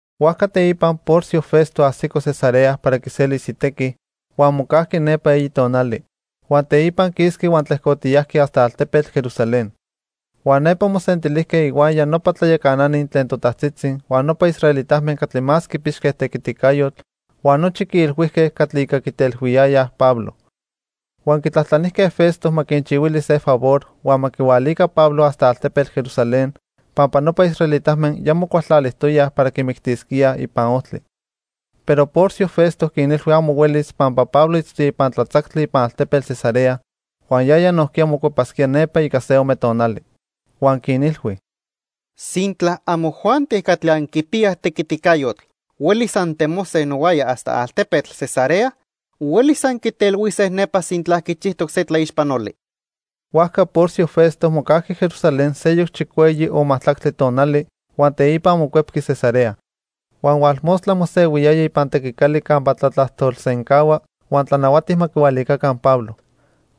Huajca teipa Porcio Festo ajsico Cesarea para quiselis itequi, huan mocajqui nepa eyi tonali, huan teipa quisqui huan tlejcotiyajqui hasta altepetl Jerusalén. Huan nepa mosentilijque ihuaya nopa tlayacanani tlen totajtzitzi huan nopa israelitame catli más quipixque tequiticayotl huan nochi quiilhuijque catli ica quitelhuiyayaj Pablo. Huan quitlajtlanijque Festo ma quinchihuili se favor huan ma quihualica Pablo hasta altepetl Jerusalén pampa nopa israelitame ya mocualtlalijtoyaj para quimictisquíaj ipan ojtli. Pero Porcio Festo quinilhui amo huelis pampa Pablo itztoya ipan tlatzactli ipan altepetl Cesarea huan yaya nojquiya mocuepasquía nepa ica se ome tonali. Huan quinilhui: —Sintla amojuanti catli anquipiyaj tequiticayotl huelis antemose nohuaya hasta altepetl Cesarea, huelis anquitelhuise nepa sintla quichijtoc se tlaixpanoli. Huajca Porcio Festo mocajqui Jerusalén seyoc chicueyi o majtlactli tonali huan teipa mocuepqui Cesarea. Huan hualmostla mosehuiyaya ipan tequicali campa tlatlajtolsencahua huan tlanahuati ma quihualicaca Pablo.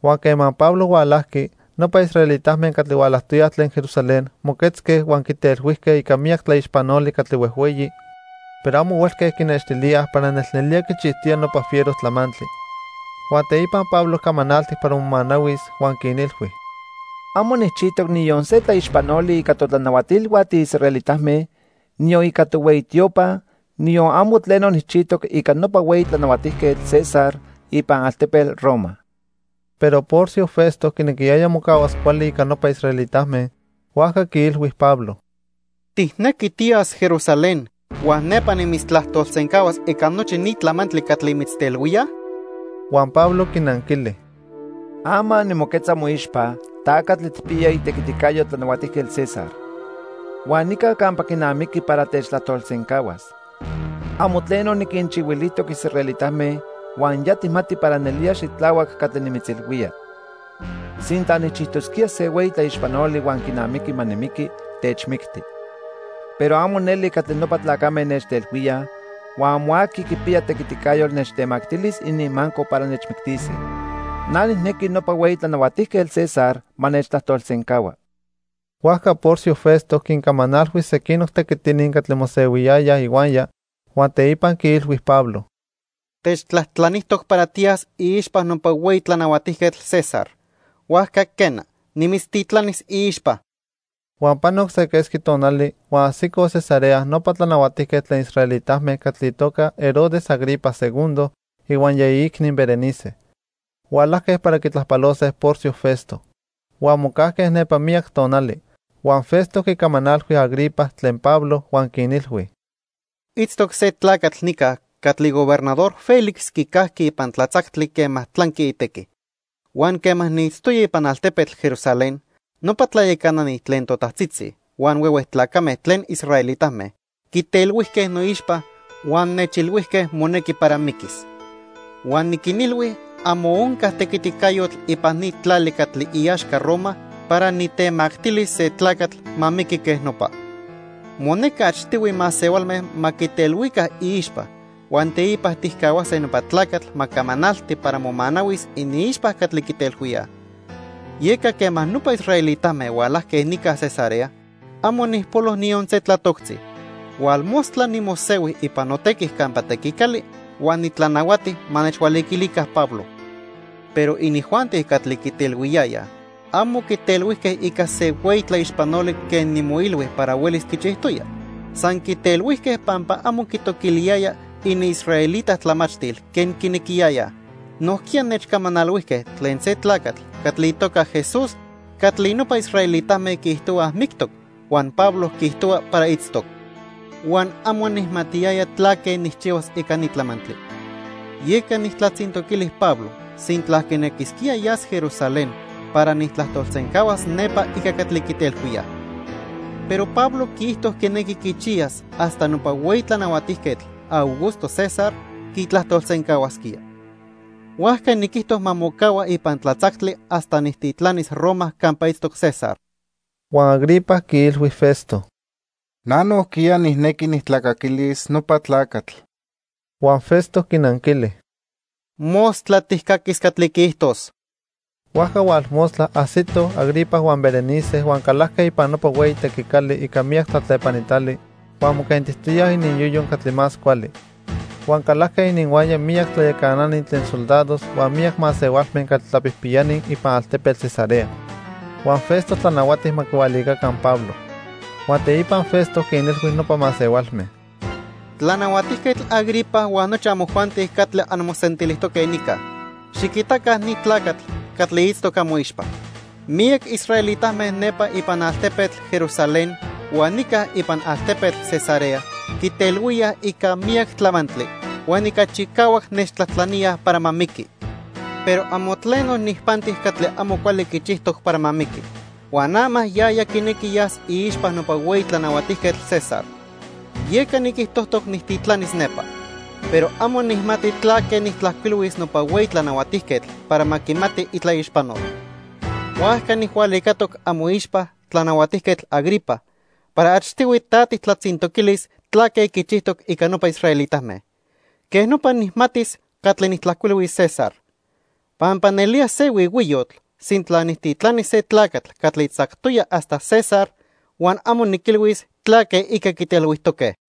Huan quema Pablo hualajqui, nopa israelitame catli hualajtoyaj tlen Jerusalén moquetzque huan quitelhuijque ica miyac tlaixpanoli catli huejhueyi, pero amo huelque quinextilíaj para nelnelía quichijtoya nopa fiero tlamantli. Huan teipa Pablo camanaltic para momanahuis huan quinilhui: —Amo nijchijtoc niyon se tlaixpanoli ica totlanahuatilhua tiisraelitame, niyon ica tohueyi tiopa, niyon amo tleno nijchijtoc ica nopa hueyi tlanahuatijquetl, César, ipan altepetl Roma. Pero Porcio Festo quinequiyaya mocahuas cuali ica nopa israelitame, huajca quiilhui Pablo: —¿Tijnequi tiyas Jerusalén huan nepa nimitztlajtolsencahuas ica nochi ni tlamantli catli mitztelhuíaj? Huan Pablo quinanquili: —Ama nimoquetza moixpa, ta catli tijpiya itequiticayo Tlanahuatijquetl César. Huan nica campa quinamiqui para techtlajtolsencahuas. Amo tleno niquinchihuilijtoc israelitame huan ya tijmati para nelía xitlahuac catli nimitzilhuía. Sintla nijchijtosquía se hueyi tlaixpanoli huan quinamiqui ma nimiqui, techmicti. Pero amo neli catli nopa tlacame nechtelhuíaj, huan amo aqui quipiya tequiticayotl nechtemactilis ininmaco para nechmictise. Na nijnequi nopa hueyi tlanahuatijquetl, César, ma nechtlajtolsencahua. Huajca Porcio Festo quincamanalhui sequinoc tequitini catli mosehuiyayaj ihuaya, huan teipa quiilhui Pablo: —Techtlajtlanijtoc para tiyas iixpa nopa hueyi tlanahuatijquetl, César, huajca quena, nimitztitlanis iixpa. Huan panoc se quesqui tonali huan ajsicoj Cesarea nopa tlanahuatijquetl tlen israelitame catli itoca Herodes Agripa II ihuaya iicni Berenice. Hualajque para quitlajpalose Porcio Festo. Huan mocajque nepa miyac tonali. Huan Festo quicamanalhui Agripa tlen Pablo huan quinilhui: —Itztoc se tlacatl nica catli Gobernador Félix quicajqui ipan tlatzactli quema tlanqui itequi. Huan quema niitztoya ipan altepetl Jerusalén, nopa tlayacanani tlen totajtzitzi huan huehue tlacame tlen israelitame quitelhuijque noixpa huan nechilhuijque monequi para miquis. "Huan niquinilhui amo onca tequiticayotl ipan ni tlali catli iaxca Roma para nitemactilis se tlacatl ma miqui quej nopa. Monequi achtihui masehualme ma quitelhuica iixpa huan teipa tijcahuase nopa tlacatl ma camanalti para momanahuis iniixpa catli quitelhuíaj. Yeca quema nopa israelitame hualajque nica Cesarea, amo nijpolo niyon se tlatoctzi. Hualmostla nimosehui ipan notequi campa tequicali huan nitlanahuati ma nechhualiquilica Pablo. Pero inijuanti catli quitelhuiyayaj amo quitelhuijque ica se hueyi tlaixpanoli quen nimoilhui para huelis quichijtoya. San quitelhuijque pampa amo quitoquiliyaya iniisraelita tlamachtil quen quinequiyayaj. Nojquiya nechcamanalhuijque tlen se tlacatl catli itoca Jesús catli nopa israelitame quiijtohuaj mictoc, huan Pablo quiijtohua para itztoc. Huan amo nijmatiyaya tlaque nijchihuas ica ni tlamantli; yeca nijtlatzintoquili Pablo sintla quinequisquía yas Jerusalén para nijtlajtolsencahuas nepa ica catli quitelhuíaj. Pero Pablo quiijto quinequi quichiyas hasta nopa hueyi tlanahuatijquetl, Augusto César, quitlajtolsencahuasquía. Huajca niquijto ma mocahua ipan tlatzactli hasta nijtitlanis Roma campa itztoc César." Huan Agripa quiilhui Festo: —Na nojquiya nijnequi nijtlacaquilis nopa tlacatl. Huan Festo quinanquili: —Mostla tijcaquis catli quiijtos. Huajca hualmostla ajsitoj Agripa huan Berenice huan calajque ipan nopa hueyi tequicali ica miyac tlatlepanitali huan moquentitoyaj ininyoyo catli más cuali. Huan calajque ininhuaya miyac tlayacanani tlen soldados huan miyac masehualme catli tlapijpiyani ipan altepetl Cesarea. Huan Festo tlanahuati ma quihualicaca Pablo. Huan teipa Festo quinilhui nopa masehualme: —Tlanahuatijquetl Agripa huan nochi amojuanti catli anmosentilijtoque nica, xiquitaca ni tlacatl catli itztoc amoixpa. Miyac israelitame nepa ipan altepetl Jerusalén huan nica ipan altepetl Cesarea quitelhuíaj ica miyac tlamantli huan ica chicahuac nechtlajtlaníaj para ma miqui. Pero amo tleno nijpanti catli amo cuali quichijtoc para ma miqui, huan ama yaya quinequi yas iixpa nopa hueyi tlanahuatijquetl César. Yeca niquijtojtoc nijtitlanis nepa. Pero amo nijmati tlaque nijtlajcuilhuis nopa hueyi tlanahuatijquetl para ma quimati itlaixpanol. Huajca nijhualicatoc amoixpa, Tlanahuatijquetl Agripa, para achtihui ta tijtlatzintoquilis tlaque quichijtoc ica nopa israelitame. Quej nopa nijmatis catli nijtlajcuilhuis César. Pampa nelía se huihuiyotl sintla nijtitlanis se tlacatl catli tzactoya hasta César huan amo niquilhuis tlaque ica quitelhuijtoque.